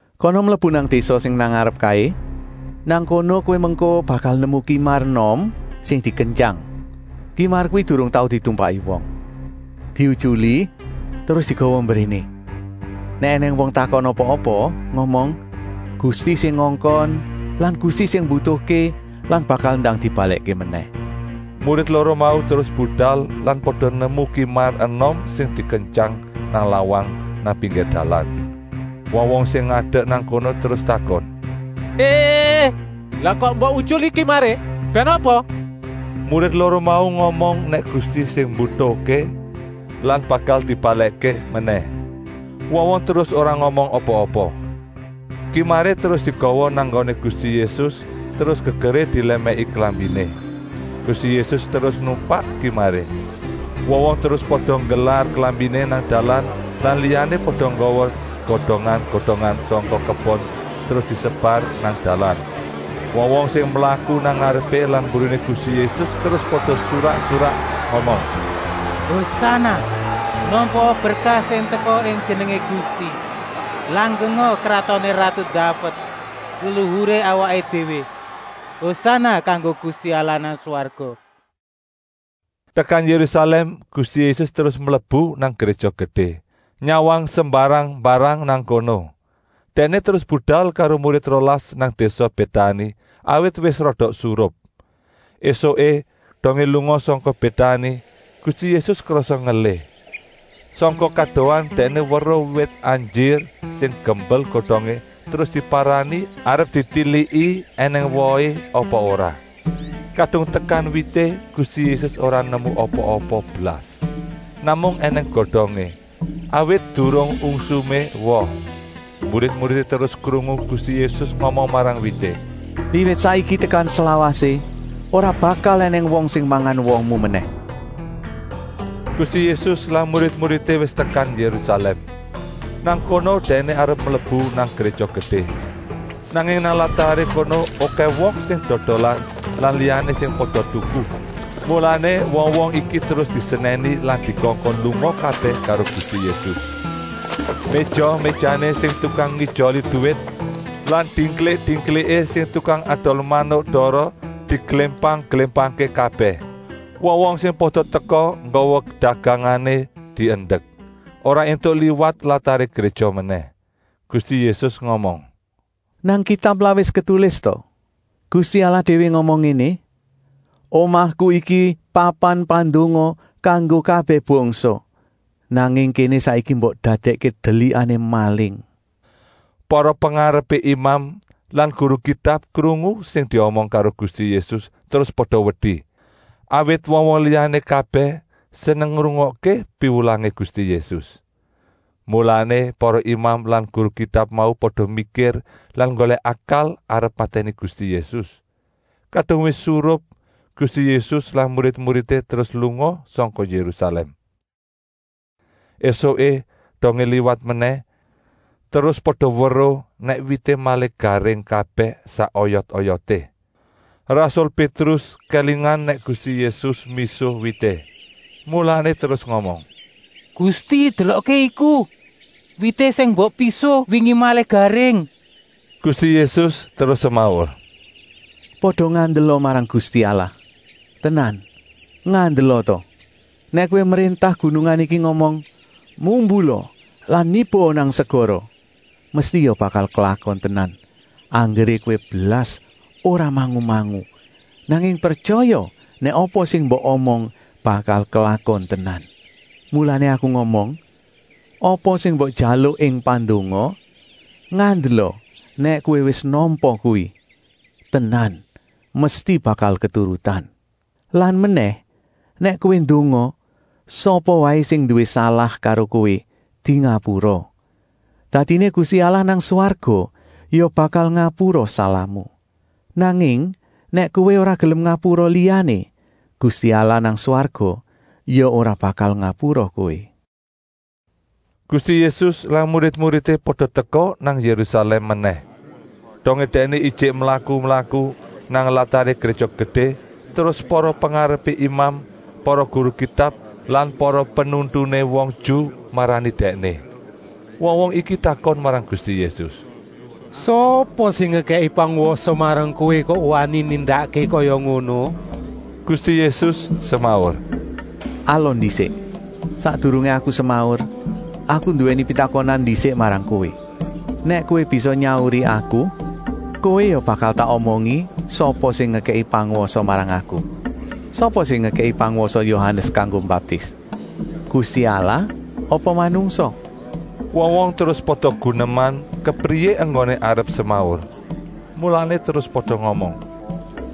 “Kana mlebu nang désa sing nang ngarep kaé. Nang kono kowé mengko bakal nemu kimar enom sing dikentyang. Kimar kuwi durung tau ditumpaki wong. Diutyuli terus digawa mbréné. Nèk ènèng wong takon apa-apa, ngomong: ‘Gusti sing ngongkon lan Gusti sing mbutuhké lan bakal ndang dibalèkké menèh.’” Murid loro mau terus budal lan pada nemu kimar enom sing dikentyang nang lawang nang pinggir dalan. Wong-wong sing ngadek nang kono terus takon: “Lah kok mbok utyuli kimaré, bèn ngapa?” Murid loro mau ngomong nèk Gusti sing mbutuhké lan bakal dibalèkké menèh. Wong-wong terus ora ngomong apa-apa. Kimaré terus digawa nang nggoné Gusti Yésus terus gegeré dilèmèki klambiné. Gusti Yésus terus numpak kimaré. Wong-wong terus pada nggelar klambiné nang dalan lan liyané pada nggawa godongan-godongan sangka kebon terus disebar nang dalan. Wong-wong sing mlaku nang ngarepé lan mburiné Gusti Yésus terus pada surak-surak ngomong: “Hosana! Nampaa berkah sing teka ing jenengé Gusti! Langgenga kratoné ratu Daved, leluhuré awaké déwé. Hosana kanggo Gusti Allah nang swarga.” Tekan Yérusalèm Gusti Yésus terus mlebu nang Gréja Gedé, nyawang sembarang-mbarang nang kono. Dèkné terus budal karo murid rolas nang désa Bétani, awit wis rada surup. Esuké, dongé lunga sangka Bétani, Gusti Yésus krasa ngelih. Sangka kadohan Dèkné weruh wit anjir sing gembel godongé terus diparani arep ditiliki ènèng wohé apa ora. Kadung tekan wité Gusti Yésus ora nemu apa-apa blas. Namung ènèng godongé, awit durung ungsumé woh. Murid-muridé terus krungu Gusti Yésus ngomong marang wité: “Wiwit saiki tekan slawasé ora bakal ènèng wong sing mangan wohmu menèh!” Gusti Yésus lan murid-muridé wis tekan Yérusalèm. Nang kono Dèkné arep mlebu nang Gréja Gedé. Nanging nang lataré kono okèh wong sing dodolan lan liyané sing pada tuku. Mulané wong-wong iki terus disenèni lan dikongkon lunga kabèh karo Gusti Yésus. Méja-méjané sing tukang ngijoli duwit lan dingklik-dingkliké sing tukang adol manuk dara diglémpang-glémpangké kabèh. Wong-wong sing pada teka nggawa dagangané diendek, ora éntuk liwat lataré gréja menèh. Gusti Yésus ngomong: “Nang Kitab lak wis ketulis ta! Gusti Allah déwé ngomong ngéné: ‘Omahku iki papan pandonga kanggo kabèh bangsa.’ Nanging kéné saiki mbok dadèkké delikané maling.” Para pengarepé imam lan guru Kitab krungu sing diomong karo Gusti Yésus terus pada wedi, awit wong-wong liyané kabèh seneng ngrungokké piwulangé Gusti Yésus. Mulané para imam lan guru Kitab mau pada mikir lan nggolèk akal arep matèni Gusti Yésus. Kadung wis surup Gusti Yésus lan murid-muridé terus lunga sangka Yérusalèm. Esuké, dongé liwat menèh, terus pada weruh nèk wité malih garing kabèh sak oyot-oyoté. Rasul Pétrus kélingan nèk Gusti Yésus misuh wité, mulané terus ngomong: “Gusti, delokké iku, wité sing mbok pisuh wingi malih garing.” Gusti Yésus terus semaur: “Pada ngandela marang Gusti Allah. Tenan, ngandela ta! Nèk kowé mréntah gunungan iki ngomong: ‘Mumbula lan nibaa nang segara,’ mesti ya bakal klakon tenan, anggeré kowé blas ora mangu-mangu, nanging pretyaya nèk apa sing mbok omong bakal klakon tenan. Mulané Aku ngomong: apa sing mbok jaluk ing pandonga, ngandela nèk kowé wis nampa kuwi, tenan, mesti bakal keturutan. Lan menèh, nèk kowé ndonga, sapa waé sing nduwé salah karo kowé dingapura. Dadiné Gusti Allah nang swarga ya bakal ngapura salahmu. ( Nanging nèk kowé ora gelem ngapura liyané, Gusti Allah nang swarga ya ora bakal ngapura kowé.”) Gusti Yésus lan murid-muridé pada teka nang Yérusalèm menèh. Dongé Dèkné ijik mlaku-mlaku nang lataré Gréja Gedé terus para pengarepé imam, para guru Kitab lan para penuntuné wong Ju marani Dèkné. Wong-wong iki takon marang Gusti Yésus: “Sapa sing ngekèki pangwasa marang Kowé kok wani nindakké kaya ngono?” Gusti Yésus semaur: “Alon ndisik, sakdurungé Aku semaur, Aku nduwèni pitakonan ndisik marang kowé. Nèk kowé bisa nyauri Aku, kowé ya bakal tak omongi sapa sing ngekèki pangwasa marang Aku! Sapa sing ngekèki pangwasa Yohanes kanggo mbaptis? Gusti Allah apa manungsa?” Wong-wong terus pada guneman kepriyé enggoné arep semaur.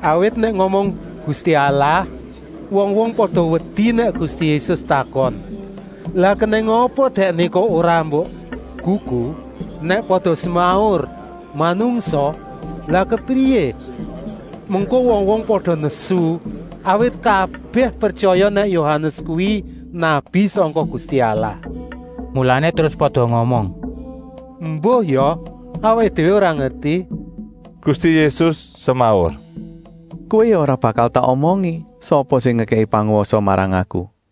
Awit nèk ngomong: “Gusti Allah,” wong-wong pada wedi nèk Gusti Yésus takon: “Lah kenèng apa dèkné kok ora mbok gugu?” Nèk pada semaur: “Manungsa,” lah kepriyé, mengko wong-wong pada nesu, awit kabèh pretyaya nèk Yohanes kuwi nabi sangka Gusti Allah. Mulané terus pada ngomong: “Embuh ya, awaké déwé ora ngerti!” Gusti Yésus semaur: “Kowé ya ora bakal tak omongi sapa sing ngekèki pangwasa marang Aku!”